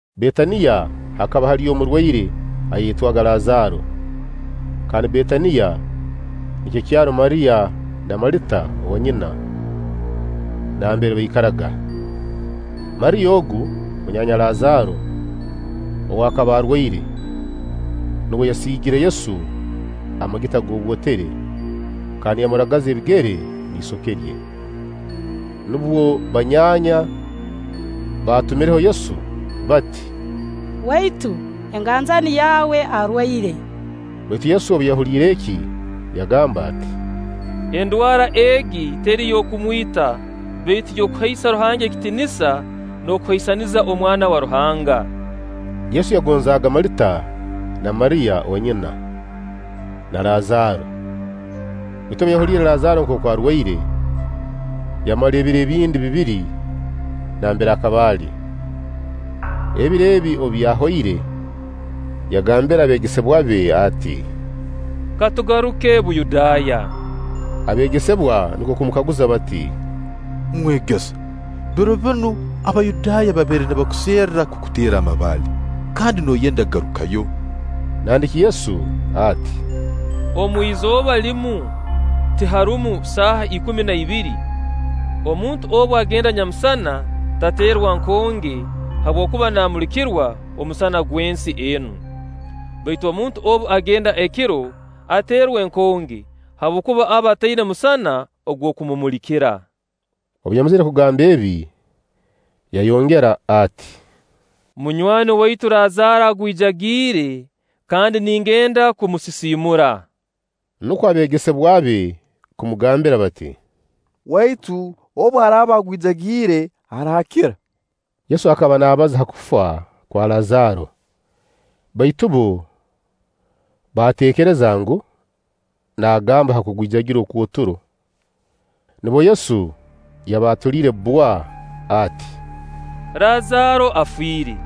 Betaniya hakaba haliyo omurwaire ayayetwaga Lazaaro. Kandi Betaniya nikyo kyaro Mariya na Malita owanyina, nambere baikaraga. Mariya ogu, munyaanya Lazaaro ow'akaba arwaire, nuwe yasiigire Yesu amagita g'obwotere kandi yamuragaza ebigere n'isoke rye. Nubwo banyaanya baatumireho Yesu bati: “Waitu, enganjani yawe arwaire.” Baitu Yesu obu yahuliire eki, yagamba ati: “Endwara egi teri y'okumwita, baitu y'okuhaisa Ruhanga ekitiinisa, n'okuhaisaniza Omwana wa Ruhanga.” Yesu yagonzaaga Malita na Mariya owanyina, na Lazaaro; baitu obu yahuliire Lazaaro nkooku arwaire, yamara ebiro ebindi bibiri nambere akaba ali. Ebiro ebi obu byahoire, yagambira abeegesebwa be ati: “Ka tugaruke Buyudaaya.” Abeegesebwa nukwo kumukaguza bati: “Mwegesa, biro binu Abayudaaya babaire nibakuserra kukuteera amabaale, kandi nooyenda kugarukayo?” Nandiki Yesu ati: “Omwizooba limu tiharumu saaha ikumi na ibiri? Omuntu obu agenda nyamusana tateerwa nkonge, habwokuba naamulikirwa omusana gw'ensi enu. Baitu omuntu obu agenda ekiro ateerwa enkonge, habwokuba aba ataina musana ogw'okumumulikira.” Obu yamazire kugamba ebi yayongera ati: “Munywani waitu Lazaaro agwijagiire, kandi ningenda kumusisiimura.” Nukwo abeegesebwa be kumugambira bati: “Waitu obu araaba agwijagiire, araakira.” Yesu akaba naabaza ha kufa kwa Lazaaro, baitu bbo baatekereza ngu, naagamba ha kugwijagira okw'oturo. Nubwo Yesu yabaatuliire bbwa ati: “Lazaaro afiire;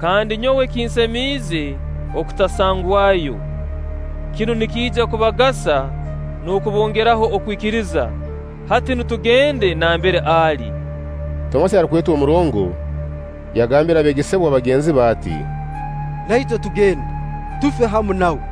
kandi nyowe kinsemiize okutasangwayo. Kinu nikiija kubagasa n'okubongeraho okwikiriza. Hati nu tugende nambere ali.” Tomasi, arukwetwa Omurongo, yagambira abeegesebwa bagenzi be ati: “Naitwe tugende, tufe hamu nawe.”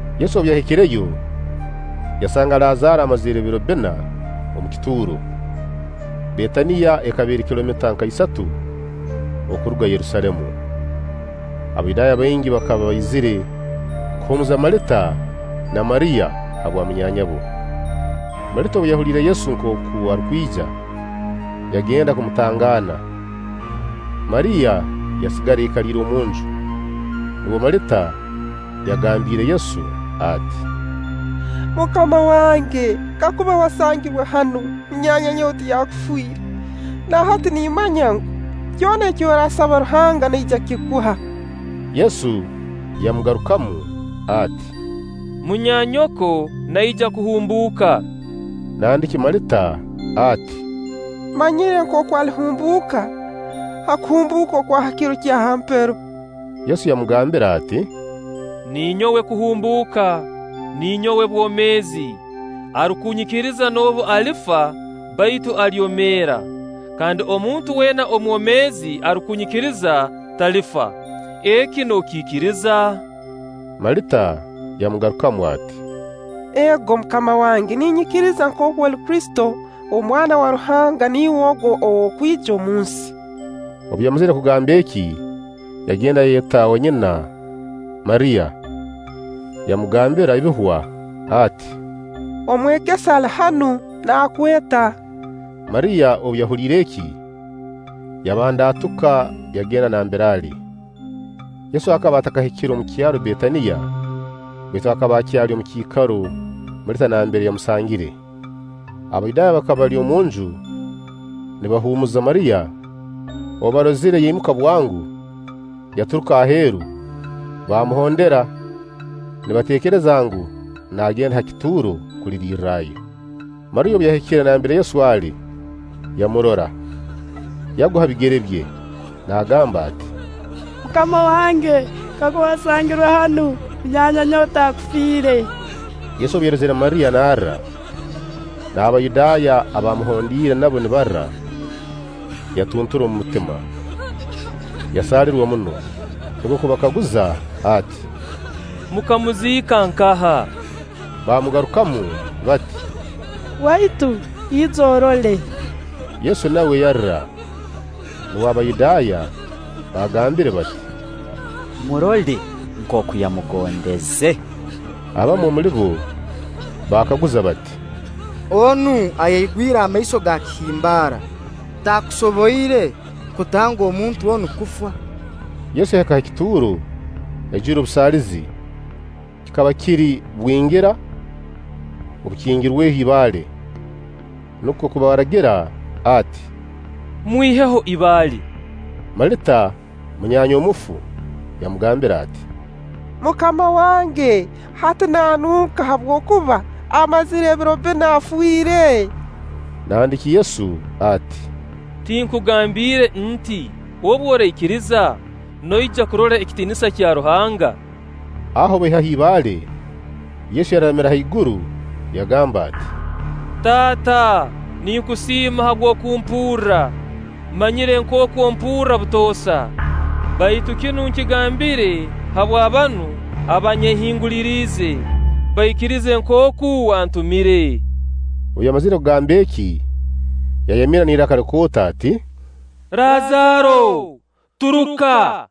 Yesu obu yahikireyo, yasanga Lazaaro amazire ebiro bbina omu kituuro. Betaniya ekaba eri kilomita nka isatu okuruga Yerusaalemu. Abayudaaya baingi bakaba baizire kuhumuuza Malita na Mariya habwa munyaanyabo. Malita obu yahuliire Yesu nkooku arukwija, yagenda kumutangaana. Mariya yasigara aikaliire omunju. Nubwo Malita yagambiire Yesu ati; “MUKAMA wange, kakuba wasangirwe hanu, munyaanya nyowe taakufiire. Na hati nimmanya ngu, kyona eki oraasaba Ruhanga, naija kukikuha.” Yesu yamugarukamu ati; “Munyaanyoko naija kuhumbuuka.” Nandiki Malita ati: “Mmanyire nkooku alihumbuuka ha kuhumbuuka okwa ha kiro kya ha mpero.” Yesu yamugambira ati: “Ninyowe kuhumbuuka, ninyowe bwomeezi; arukunyikiriza noobu alifa, baitu alyomeera; kandi omuntu weena omwomeezi arukunyikiriza, talifa. Eki nookiikiriza?” Malita yamugarukamu ati: “Ego, MUKAMA wange; ninyikiriza nkooku oli Kristo, Omwana wa Ruhanga niiwe ogu ow'okwija omunsi.” Obu yamazire kugamba eki, yagenda yayeta owanyina Mariya, yamugambira ebihwa ati: “Omwegesa ali hanu, naakweta.” Mariya obu yahuliire eki, yabandaatuka, yagenda nambere ali. Yesu akaba atakahikire omu kyaro Betaniya, baitu akaba akyali omu kiikaro Malita nambere yamusangire. Abayudaaya abakaba bali omunju nibahuumuza Mariya, obu baarozire yaimuka bwango, yaturuka aheeru, baamuhondera nibateekereza ngu, naagenda ha kituuro kulirirrayo. Mariya, obu yahikire nambere Yesu ali, yamurora, yagwa ha bigere bye, naagamba ati: “MUKAMA wange, kakuba wasangirwe hanu, munyaanya nyowe taakufiire.” Yesu obu yarozire Mariya narra, n'Abayudaaya abamuhondiire nabo nibarra, yatuntura omu mutima, yasaalirwa muno. Nukwo kubakaguza ati: “Mukamuziika nkaha?” Baamugarukamu bati: “Waitu, ija orole.” Yesu nawe yarra. Nubwo Abayudaaya baagambire bati: “Murole nkooku yamugondeze!” Abamu omuli bo baakaguza bati: “Onu ayaigwire amaiso ga kihimbaara, taakusoboire kutanga omuntu onu kufa?” Yesu yahika ha kituuro, aijwire obusaalizi. Kikaba kiri bwingira obukingirweho ibaale. Nukwo kubaragira ati: “Mwiheho ibaale.” Malita, munyaanya omufu, yamugambira ati: “MUKAMA wange, hati naanunka, habwokuba amazire ebiro bbina afiire.” Nandiki Yesu ati: “Tinkugambiire nti: Obu oraikiriza, noija kurora ekitiinisa kya Ruhanga?” Aho baihaho ibaale. Yesu yararamira haiguru yagamba ati: “Taata, ninkusiima habw'okumpurra. Mmanyire nkooku ompurra butoosa, baitu kinu nkigambire habwa banu abanyehinguliriize, baikirize nkooku wantumire.” Obu yamazire kugamba eki, yayamirra n'iraka likooto ati: “Lazaaro, turuka!”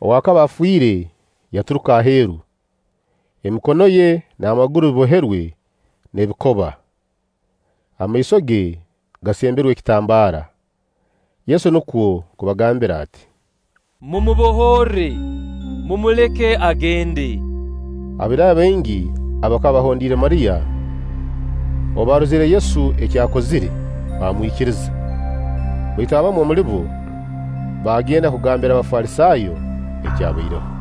Ow'akaba afiire yaturuka aheeru, emikono ye n'amaguru biboherwe n'ebikoba, amaiso ge gasemberwe ekitambaara. Yesu nukwo kubaragira ati: “Mumubohorre, mumuleke agende.” Abayudaaya baingi abakaba bahondiire Mariya, obu baarozire Yesu eki akozire, baamwikiriza; baitu abamu omuli bo baagenda kugambira Abafalisaayo ekyabaireho.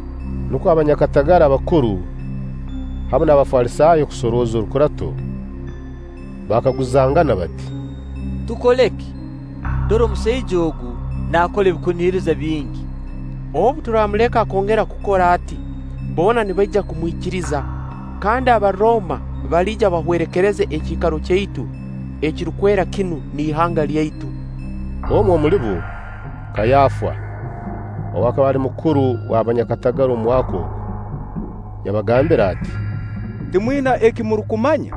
Nukwo abanyakatagara abakuru hamu n'abafalisaayo kusorooza orukurato. Baakaguzangana bati: “Tukole ki? Dora omusaija ogu naakora ebirukuhuniriza bingi. Obu turaamuleka akongera kukora ati, boona nibaija kumwikiriza; kandi Abarooma baliija bahwerekereze ekiikaro kyaitu ekirukwera kinu n'ihanga lyaitu.” Omu omuli bo, Kaayafa, ow'akaba ali mukuru w'abanyakatagara omu mwaka ogu, yabagambira ati: “Timwina eki murukumanya.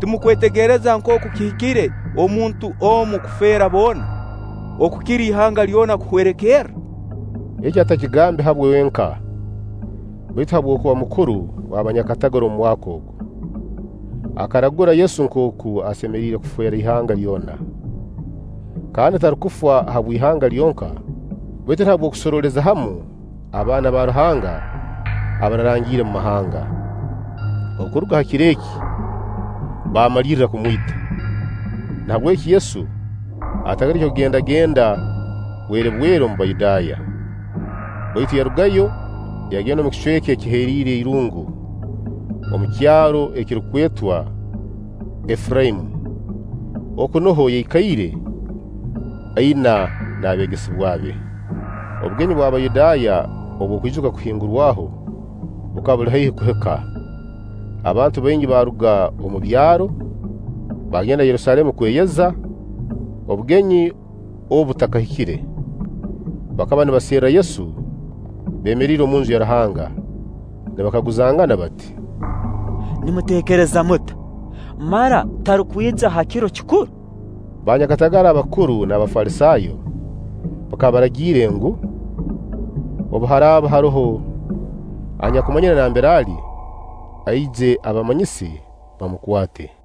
Timurukwetegereza nkooku kihikire omuntu omu kufeera boona, okukira ihanga lyona kuhwerekerra.” Eki atakigambe habwe wenka, baitu habw'okuba mukuru w'abanyakatagara omu mwaka ogu. Akaragura Yesu nkooku asemeriire kufeera ihanga lyona; kandi tarukufa habw'ihanga lyonka, baitu na habw'okusorooleza hamu abaana ba Ruhanga abaararangiire omu mahanga. Okuruga ha kiro eki, baamalirra kumwita. Nahabweki Yesu atagaruke kugendagenda bwerebwere omu Bayudaaya; baitu yarugayo, yagenda omu kicweka ekiheriire irungu, omu kyaro ekirukwetwa Efuraimu; oku nuho yaikaire aina n'abeegesebwa be. Obugenyi obw'Abayudaaya obw'okwijuka Okuhingurwaho bukaba buli haihi kuhika, abantu baingi baaruga omu byaro, baagenda Yerusaalemu kweyeza, obugenyi obu butakahikire. Bakaba nibaserra Yesu beemeriire omunju ya Ruhanga, nibakaguzangana bati: “Nimuteekereza muta? Mara, tarukwija ha kiro kikuru?” Baanyakatagara abakuru n'Abafalisaayo bakaba baragiire ngu, obu haraaba haroho anyakumanyire nambere ali, aije abamayise, bamukwate.